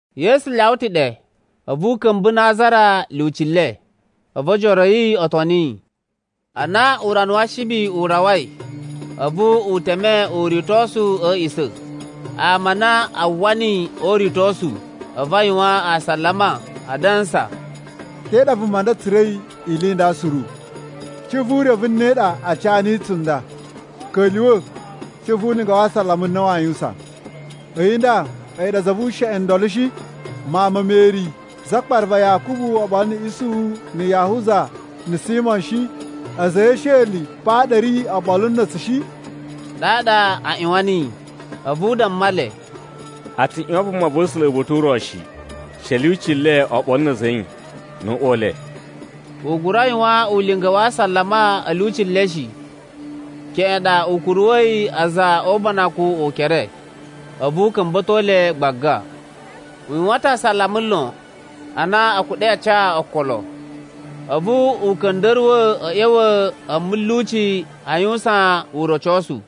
Yesu lyawa ta̱ ɗe, a̱vu u ka̱mba̱ Nazara lyuci le. A̱vu ojoro a̱ yi o toni yi. Ana urana wa Ashibi u rawai, a̱vu u teme uritosu a̱ a̱a̱ꞌisa̱. Ama a na a uwwa niyi o uritosu, a̱vu a yuwan asalama, adansa, “Te ɗa vuma nda tsura̱i ili i nda suru? Cuꞌun vu urevu ne ɗa a ca niyi tsunda? Ka̱lyuwa̱ cuꞌun vu ulinga wa asalama u na waa yuwusan. A̱yi nda, a̱yi ɗa za vu usheꞌen ndolo shi, mawun ma Meri, zakpara va Yakubu, oɓolo na̱ Isuhu, na̱ Yahuza na̱ Simo shi? A̱za̱ a̱ yi e esheli pa ɗa a̱ ri oɓolo na̱ tsu shi?” Ɗaɗa a ꞌyuwan niyi. A̱vu u damma le, “A tsu ꞌyuwan vumava̱sula̱ uba̱ta̱ u ro shi, she a̱ lyuci le oɓolo na̱ a̱za̱ a̱ yi, nu uꞌwa u le.” U gura yuwan ulinga wa asalama a̱ lyuci le shi. Keꞌen ɗa u kuruwa̱yi a̱za̱ o ubanakun ukere, a̱vu u ka̱mba̱to le gbaga. U yuwan ta̱ asalama lon, ana a̱ kuɗa̱i a ca okolo. A̱vu u ka̱nda̱ruwa̱ a̱ ꞌya̱wa̱ a̱ mulyuci a yuwusan urocosu.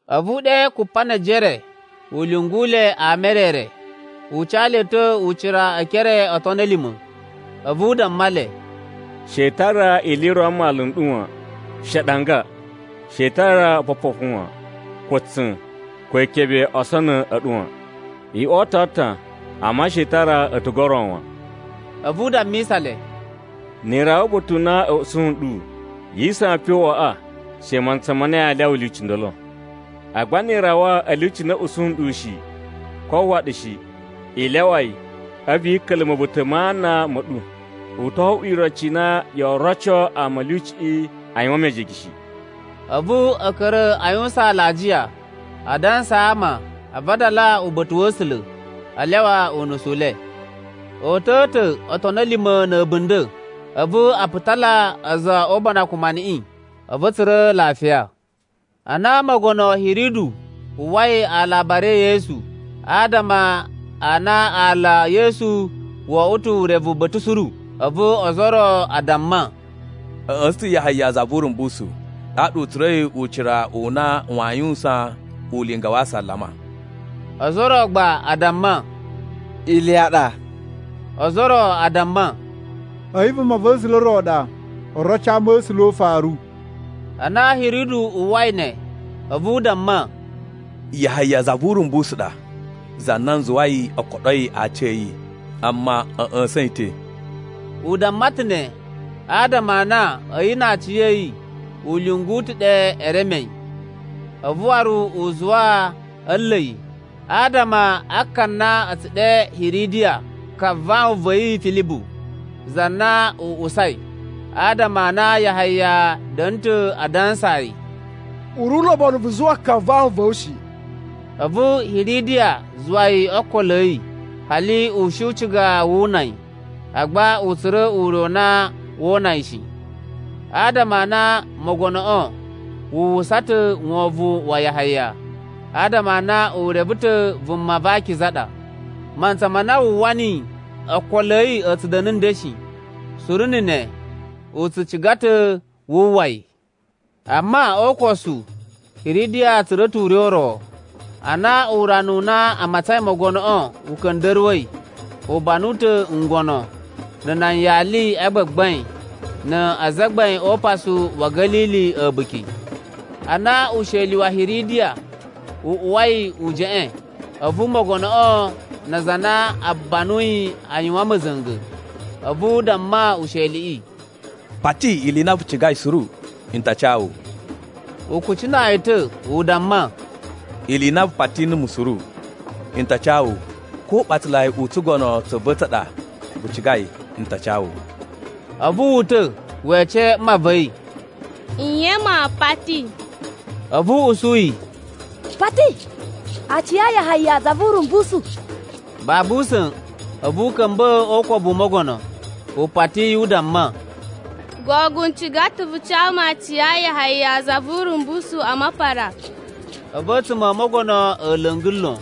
A̱vu u ɗe Kupanejere u lyungu le ama e re re. U ca le ta̱ ucira e ekere o otoni a̱ lima̱. A̱vu u damma le, “She i tara ili i ro a mmalu n ɗu wan, she aɗanga. She i tara opopofu wan, ko tsa̱n, ko ikebe o osonu a̱ ɗu wan. I oto atan, amma she i tara a̱tugu o ro wan.” A̱vu u dammisa le, “Ni i rawa uba̱ta̱ u na a̱ ushi nɗu, yi isawan pe o uꞌwaꞌa she mantsa ma na yaa lyawa lyuci ndolo. Agba ni i rawa a̱ lyuci na a̱ usu nɗu shi, ko a uwwa ɗu shi, i lyawa yi, a̱vu i ka̱ka̱la̱ ma̱buta̱ ma ana ma̱ ɗu. U to oꞌwo iroci i na yoo roco ama a̱ lyuciꞌi a yuwan mejege shi.” A̱vu a̱ ka̱ra̱ a yuwusan alajiya, a dansaa ama a vadala uba̱ta̱ wa̱ A̱sula̱, a lyawa unusu u le. O uta̱a̱ ta̱ otoni a̱ lima̱ na̱ a̱bunda̱, a̱vu a putala a̱za̱ o ubanakun maniꞌin, a̱vu a̱ tsura̱ lafiya. Ana Mogono Hiridu uwwai alabari e Yesu, adama a na aala e Yesu oꞌwo ta̱ urevu ba̱ta̱ suru. A̱vu ozo o ro a damma, “A̱ ꞌya̱sa̱n ta̱ Yahaya za vu Urumbusu. Ɗaɗa u tsura̱i ucira u na waa yuwusan ulinga wa asalama.” Ozo o ro gba a damma, “Iliya ɗa.” Ozo o ro a damma, “A̱yi vumava̱sula̱ ro ɗa, oroci a ama̱sula̱ o ufaru.” Ana Hiridu uwwai ne, a̱vu u damma, “Yahaya za vu Urumbusu ɗa, za na n zuwai o koɗoi aaci a̱ yi, amma a̱ ꞌya̱sa̱n yi ta̱.” U damma ta̱ ne adama a na a̱yi na aciya̱yi u lyungu ta̱ ɗe e reme yi. A̱vu waru u zuwa a̱ nla̱ yi, adama a ka na a̱ tsu ɗe Hiridiya ka vawun va̱ yi Filibu, za na u usai. Adama a na Yahaya da̱na̱ ta̱ a dansaa yi, “U ri ulobonu vu zuwa ka vawun va̱ wu shi.” A̱vu Hiridiya zuwa yi o ookolo a̱ yi, hali u shi u ciga woo una yi. Agba u tsura̱ ure u na wu una yi shi. Adama a na mogonoꞌo wu uwwusa ta̱ wovon wa Yahaya, adama a na u reve ta̱ vuma va akiza ɗa. Mantsa ma na wu uwwa niyi, ookolo a̱ yi a̱ tsu da̱na̱ nden shi, suru na̱ ne u tsu ciga ta̱ wu uwwa yi. Amma o ukosu, Hiridiya tsura̱ ta̱ ure u ro. Ana urana u na a matsain mogonoꞌo u ka̱nda̱ruwa̱i, u banu ta̱ ngono, na̱ nan yali a gbagbain, na azagbain o upasu wa̱ Ga̱lili a̱buki. Ana usheli wa̱ Hiridiya u uwa u jeꞌein, a̱vu mogonoꞌo na aza a na u banuyi a yuwan ma̱za̱nga̱. A̱vu u damma usheliꞌi, “Pati ili i na vu cigai suru, n ta ca wu.” U kucinaa yi ta̱, u damma, “Ili i na vu pati numu suru, n ta ca wu. Ko uɓatsalai u tsugono tsa̱ va̱ tsa ɗa vu cigai, n ta ca wu.” A̱vu wu uta̱ we ece mma va̱ yi, “Nye maa pati?” A̱vu u usu yi, “Pati aaci a Yahaya za vu Urumbusu.” Babu usa̱n, a̱vu u ka̱mba̱ o ukobu u mogono, u pati yi u damma, “Gogogo, n ciga ta̱ vu ca mu aaci a Yahaya za vu Urumbusu a mapara.” A̱vu a̱tsuma̱ o mogono a̱ la̱nga̱ lon,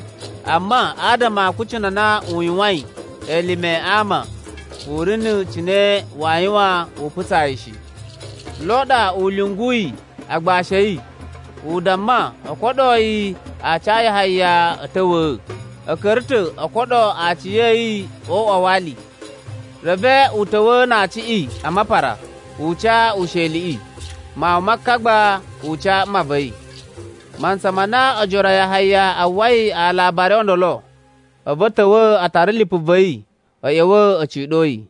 amma adama a akucunu a na u yuwain elime a ama, u ri n cine waa yuwan u putsa yi shi. Lo ɗa u lyunguyi agbashi a̱ yi, u damma o koɗoo yi aaci a Yahaya a̱ ta̱wa̱a̱. A̱ ka̱ra̱ ta̱ o koɗo aaci a̱ yi o uꞌwa wa ali. Reve u ta̱wa̱a̱ na aaciꞌi a mapara, u ca usheliꞌi. Mawun ma ka gba, u ca mma va̱ yi. Mantsa ma na ojoro a Yahaya a uwwai alabari o ndolo, a̱vu a̱ ta̱wa̱ a tara lipu va̱ yi, a̱ ꞌya̱wa̱ a̱ ciɗo yi.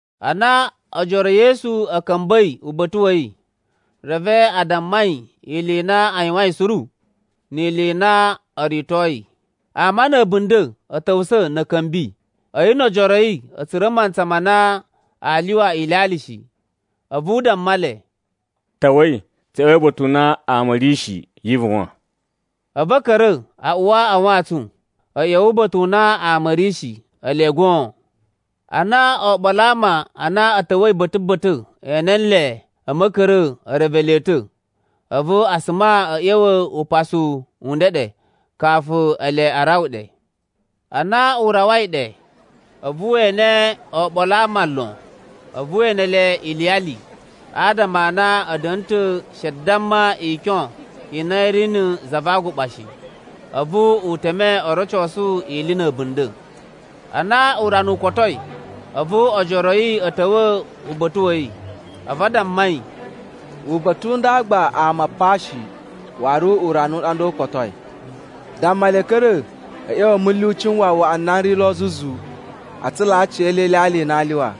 Ana ojoro e Yesu a̱ ka̱mba̱i uba̱ta̱ wa̱ yi, reve a damma yi ili i na a yuwain suru, ni ili i na o ritoi. Ama na̱ a̱bunda̱ a̱ ta̱wusa̱ na̱ a̱ ka̱mbi, a̱yi no ojoro a̱ yi a̱ tsura̱ mantsa ma na aa lyuwa ilyalya shi. A̱vu u damma le, “Ta̱wa̱i, tsu ꞌya̱wa̱i uba̱ta̱ u na ama a̱ ri shi, yi ivuwan.” A̱vu a̱ ka̱ra̱ a uwa a wantsun a̱ ꞌya̱wa̱ uba̱ta̱ u na ama a̱ ri shi, ele goon. Ana oɓolo a ama a na a̱ ta̱wa̱i ba̱ta̱ ba̱ta̱ e ene nle a̱ ma̱ka̱ra̱a̱ e reve le ta̱, a̱vu a suma a̱ ꞌya̱wa̱ upasu u ndeɗe kafu ele a rawa ɗe. Ana u rawai ɗe, a̱vu we ene oɓolo a ama lon. A̱vu we ene le iliyali, adama a na a̱ da̱na̱ ta̱ she damma ikyon i na i ri na̱ za va aguɓa shi. A̱vu u teme o rocosu ili na̱ a̱bunda̱. Ana urana u kotoi, a̱vu ojoro a̱ yi a̱ ta̱wa̱ uba̱ta̱ wa̱ yi. A̱vu a damma yi, “Uba̱ta̱ u nda gba ama pa shi, waru urana u ɗa nda u kotoi. Damma le a̱ ka̱ra̱ a̱ ꞌya̱wa̱ a̱ mulyuci n wawaꞌa n na n ri lo zuzu, a tsulaa aciyele ilyalya i na aa lyuwa.”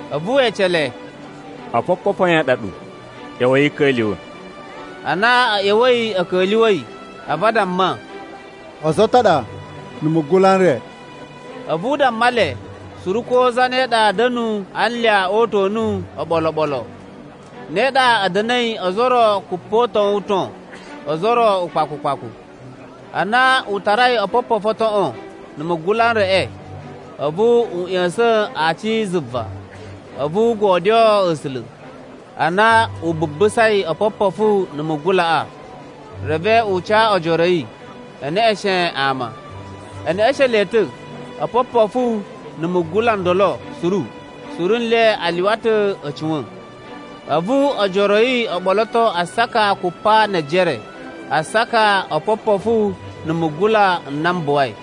A̱vu we ece le, “Opopofu a yan a ɗa ɗu? ꞌYa̱wa̱i i ka̱lyuwa̱.” Ana a̱ ꞌya̱wa̱i a̱ ka̱lyuwa̱i, a̱vu a damma, “Ozo o ton a ɗa, na̱ mugula n re.” A̱vu u damma le suru ko zane ɗa da̱nu a anlya o uta̱nu oɓolo oɓolo. Ne ɗa a̱ da̱na̱i ozo o ro kupoton-uton, ozo o ro ukpaku ukpaku. Ana u tarai opopofu o toꞌon na̱ mugula n reꞌe, a̱vu u ꞌya̱sa̱n aaci zuva, a̱vu u godyoo A̱sula̱. Ana u bubusai opopofu na̱ mugulaꞌa, reve u ca ojoro a̱ yi, e neꞌeshen ama. E neꞌeshen le ta̱ opopofu na̱ mugula n ndolo suru. Suru nle a lyuwa ta̱ a̱ cuwa̱n. A̱vu ojoro a̱ yi o ɓoloto asaka kupa ne ejere, asaka o opopofu na̱ mugula n na m buwai.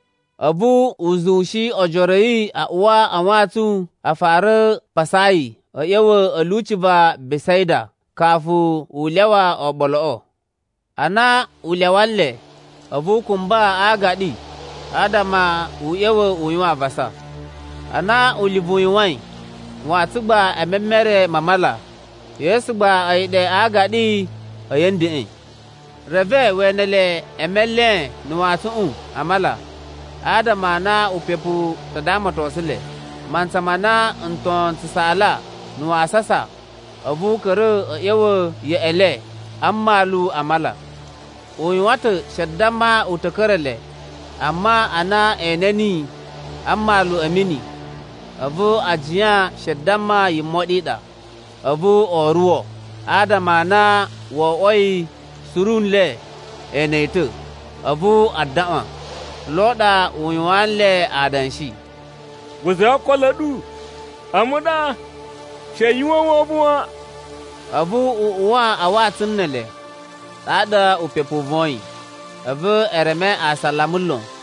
A̱vu u zuwushi ojoro a̱ yi a uwa a wantsun a fara pasaa yi a̱ ꞌya̱wa̱ a̱ lyuci va Besaida, kafu u lyawa oɓoloꞌo. Ana u lyawa nle, a̱vu u kumba a aagaɗi, adama u ꞌya̱wa̱ u yuwan avasa. Ana ulivu u yuwain, wantsun gba e memere ma mala, Yesu gba a̱yi ɗe a aagaɗi a̱yi a̱ ndeꞌen. Reve we ene le e melen na̱ wantsuꞌun a mala, adama a na upepu u ta damatosun le. Mantsa ma na nton n tsu saala na̱ wasasa, a̱vu u ka̱ra̱ a̱ ꞌya̱wa̱ yeꞌe le a mmalu a mala. U yuwan ta̱ she damma u ta̱ ka̱ra̱ le, amma ana e ene niyi a mmalu a̱ mini, a̱vu a jiyan she damma yimoɗi i ɗa. A̱vu o oruwo, adama a na wo oꞌwoi suru nle e ene yi ta̱, a̱vu a daꞌwan. Lo ɗa u yuwaan nle adanshi, “Guza̱i okolo a̱ ɗu, a̱mu ɗa. She yu uwwa wovon wan.” A̱vu u uwa a wantsun ne ele, ɗaɗa upepu u voyin. A̱vu e reme asalama lon,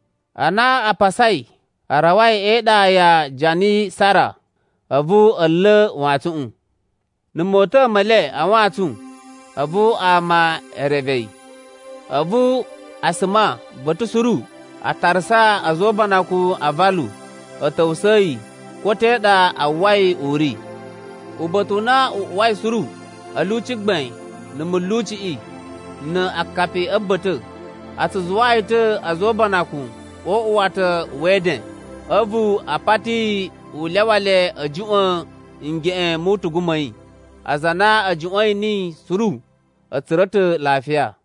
Ana a pasai, a rawai e iɗa ya Janisara, a̱vu a̱ nla̱ wantsuꞌun. Na̱ mota̱a̱ me le a wantsun, a̱vu ama e reve yi. A̱vu a suma ba̱ta̱ suru a tarasa a̱za̱ o ubanakun a avalu a̱ ta̱wusa̱a̱ yi ko te ɗa a uwwai u ri. Uba̱ta̱ u na u uwai suru, a̱ lyuci gbain na̱ mulyuciꞌi na akapi a̱ ba̱ta̱, a tsu zuwaa yi ta̱ a̱za̱ o ubanakun o uꞌuwata we eden. A̱vu, a pati yi u lyawa le a̱ juꞌwa̱n ngeꞌen mu utugu ma̱ yi. Aza a na a̱ juꞌwa̱n niyi suru a̱ tsura̱ ta̱ lafiya.